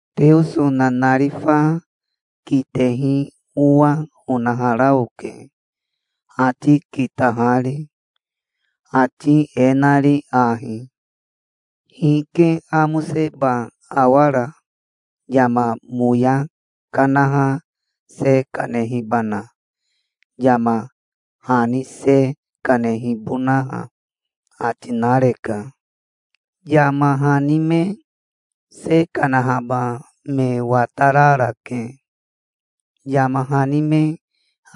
Teoso nanarifa kitehi owa onahara oke, ati kitahari, ati e nari ahi: "Hike amoseba awara, yama moya kanaha se kanehibana, yama hani se kanehibonaha?" ati nareka. Yama hani me se kanahaba me watararake, yama hani me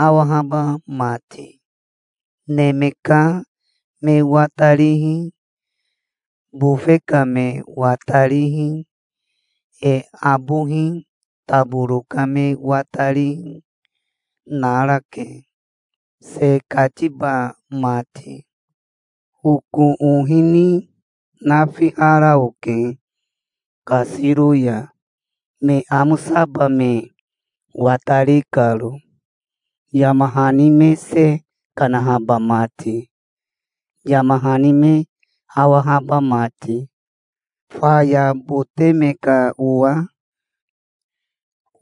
awahaba mati. Neme ka me watarihi, bofe ka me watarihi, e abohi taboro ka me watarihi narake, se katiba mati. Oko ohi ni nafihara oke kasiro ya, me amosaba me watari karo, yama hani me se kanahaba mati, yama hani me awahaba mati. Faya bote me ka owa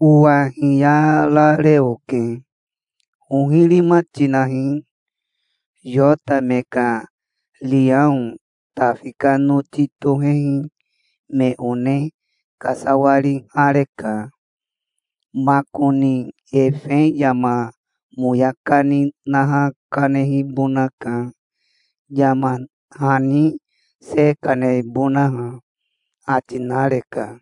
owa hiyarare oke. "Ohirima tinahi. Yota me ka riao Tafi ka noti tohehi me one kasawarihareka. Makoni efe yama moya kani naha kanehibonaka, yama hani se kanebonaha", ati nareka.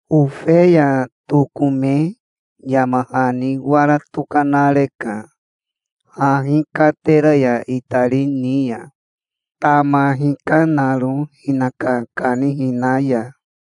Ofeya tokome yama hani wara tokanareka, hahi katera ya itari ni ya, tama hikanaro hinaka kanihina ya.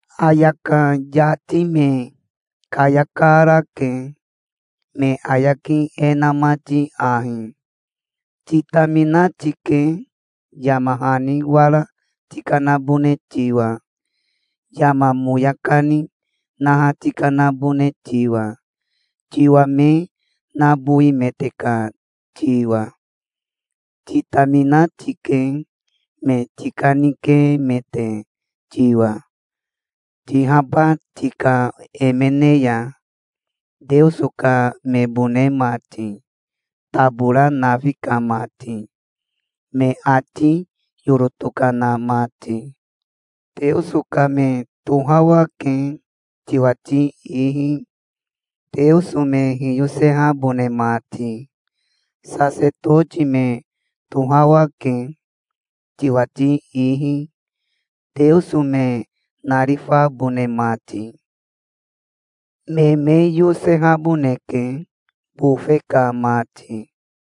Ayaka yati me kayakarake, me ayaki e na mati ahi: "Titamina tike, yama hani wara tikanabone tiwa, yama moya kani naha tikanabone tiwa, tiwa me nabowimete ka tiwa. Titamina tike, me tikanikemete tiwa, tihaba tika emene ya, Teoso ka mebone mati, tabora nafi ka mati, me ati yoro tokana mati. Teoso ka me tohawake, tiwati ihi, Teoso me hiyosehabone mati. Sasetoti me tohawake, tiwati ihi, Teoso me narifabone mati. Me me yosehaboneke, bofe ka mati".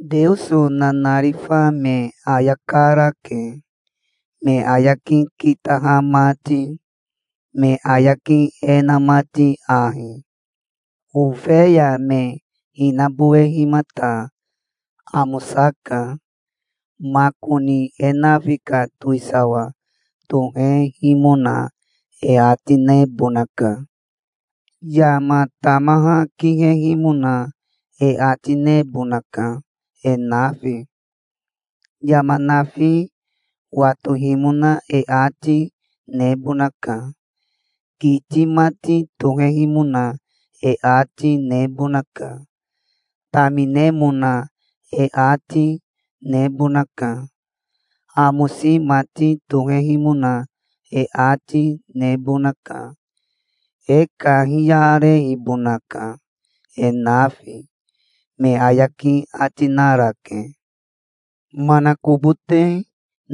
Teoso nanarifa me ayakarake, me ayaki kitaha mati, me ayaki e na mati ahi: "Ofeya me hinabowehimata amosaka. Makoni e nafi ka towisawa tohehimona e ati nebonaka. Yama tamaha kihehimona e ati nebonaka, e nafi. Yama nafi watohimona e ati nebonaka. Kiti mati tohehimona e ati nebonaka. Taminemona e ati nebonaka. Amosi mati tohehimona e ati nebonaka. E kahiyarehibonaka, e nafi", me ayaki ati narake. Manakobote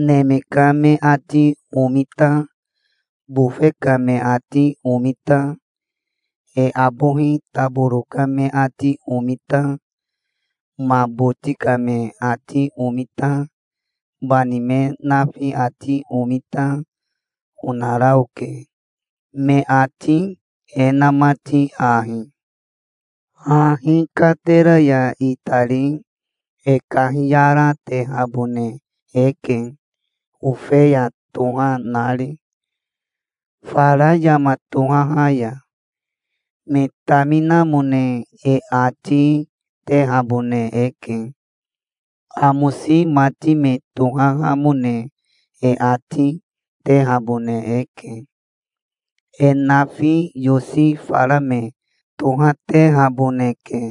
neme ka me ati omita, bofe ka me ati omita, e abohi taboro ka me ati omita, ma boti ka me ati omita, bani me nafi ati omita, onara oke, me ati e na mati ahi: "Hahi katera ya itari e kahiyaratehabone eke Ofeya toha nari, fara yama tohaha ya. Me taminamone e ati tehabone eke. Amosi mati me tohahamone e ati tehabone eke. E nafi yosi fara me tohatehaboneke".